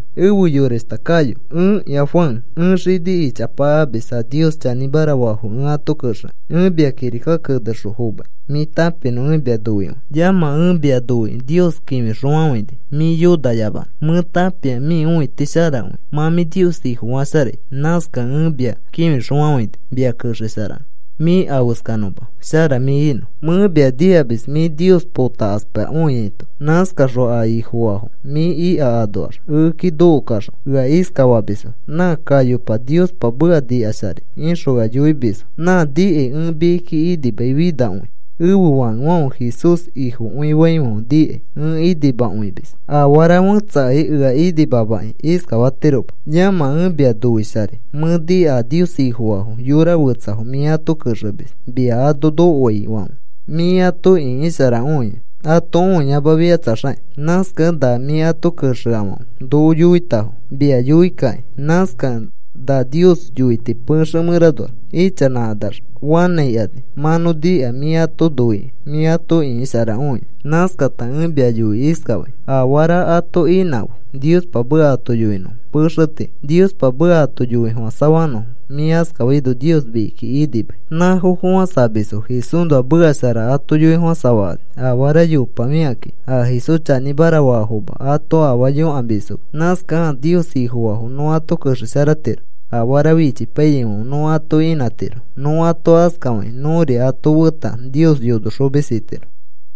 Efe yorashta Gayo, ẽkĩa Juan. Ẽ xini ichapa amis a Nios chanĩmara faafo ẽ ato kexekĩ. Ẽ mia kirika kenexõ fomai mĩ tãpinõ. Ẽ mia noikõi. Yamã, ẽ mia noikĩ Nios kĩfixõfafãini mĩ yonayamanõ. Mẽ tãpia mĩ õiti sharakõi mã mĩ Nios Ifofasharai. Nãskakẽ ẽ mia kĩfixõfafãini mia kexesharanõ mĩ afeskanõma shara mĩ inõ. Mẽ mia nikamis mĩ Nios potakaspakõiaito. Nãskaxõ a Ifofafo mĩ ika anoax ekeki nokokaxõ ea iskafamisfo: “Nã Gayopa Niospa meka nikasharai,” ixõ ea yoimisfo. Nã nikai ẽ mikiki inimai finakõi. Ẽfe fakefãfe Jesús Ifokõifaifãfe nikai ẽ inimakõimis. Afara fẽtsakai ea inimamakĩ iskafatiroma. Yamã, ẽ mia noisharai. Mẽ nika a Nios Ifofaafo yora fetsafo mĩ ato kexemis mia ano nokoaifãfe, mĩ ato ĩkisharakõia, ato õiyamafikatsaxakĩ. Nãskakẽ na mĩ ato kexeafãfe noko yoitafo mia yoikakĩ. Nãskakẽ na Nios yoiti pexe mẽranoax ichanãkanax fanãikani mã nõ nika mĩ ato noikĩ, mĩ ato ĩkisharakõia. Nãskata ẽ mia yoikĩ iskafai: Afara ato inãfe Niospa meka ato yoinõfo pexe tii, Niospa meka ato yoifofãsafanõfo. Mĩ askafaino Nios mikiki inimai. Nãfo fofãsamisfo Jesúsnoa meka shara ato yoifofãsafakani. Afara yopafikãki a Jesús chanĩmara faafoma ato afaa yõkamisfoma. Nãskakẽ a Nios Ifofaafo nõ ato kexesharatiro afara fichipaiyaifãfe nõ ato inãtiro. Nõ ato askafakĩ nõri ato feta Nios yonoxomis itiro.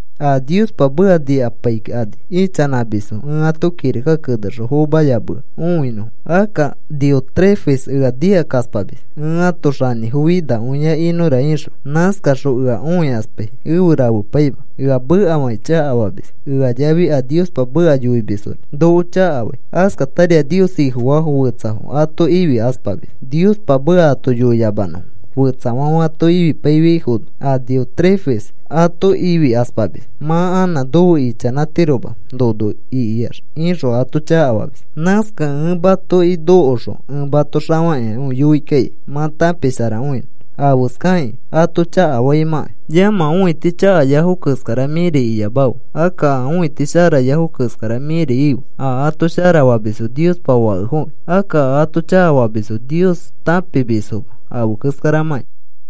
A Niospa meka nikapaikani ichanãmisfo ẽ ato kirika kenexõ fomayamea õinõfo. Akka Diótrefes ea nikakaspamis, “Ẽ ãto xanĩfo finakõia inõra,” ixõ. Nãskaxõ ea õikaspai, efe rafepaima. Ea mekafakĩ chakafamis, ea yafi a Niospa meka yoimisfori noko chakafai. Askatari a Nios Ifofaafo fetsafo ato ifikaspamis Niospa meka ato yoiyamanõfo. Fetsafãfe ato ifipaifiaifono a Diótrefes ato ifimakaspamis. “Mã anã nofe ichanãtiroma nono ikiax,” ixõ ato chakafamis. Nãskakẽ ẽ matoki nokoxõ ẽ mato xafakĩakõi yoi kaikai mã tãpisharakõinõ, afeskakĩ ato chakafaimãkai. Yamã, õiti chakayafo keskara mĩri iyamafe. Akka a õiti sharayafo keskara mĩri ife. A ato sharafamisfo Niospa fakefokĩ. Akka a ato chakafamisfo Nios tãpimisfoma afe keskaramãki.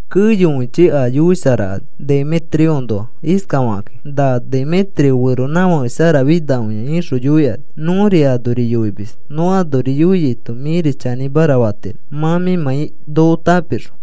Keyokõichi a yoisharakani Demetrioõnoa iskafakakĩ: “Na Demetrio feronãfake sharafinakõia,” ixõ yoikani. Nõri anori yoimis. Nõ anori yoiaito mĩri chanĩmara fatiro, mã mĩmãi noko tãpixõ.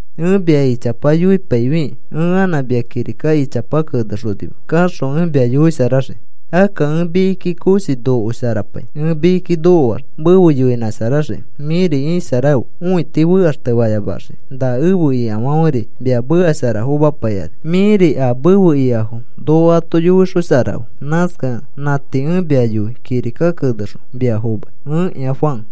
Ẽ mia ichapa yoipaifikĩ ẽ anã mia kirika ichapa kenexonima. Kaxõ ẽ mia yoisharaxiki. Akka ẽ mikiki koshi nokosharapai. Ẽ mikiki nokoax mefe yoinõnãsharaxiki. Mĩri isharafe, õiti fekaxteyamaxiki. Na efe ikafãferi mia meka shara fomapaikani. Mĩri a mefe ikafo noko ato yoixosharafe. Nãskakẽ nã tii ẽ mia yoi kirika kenexõ mia fomai. Ẽkĩa Juan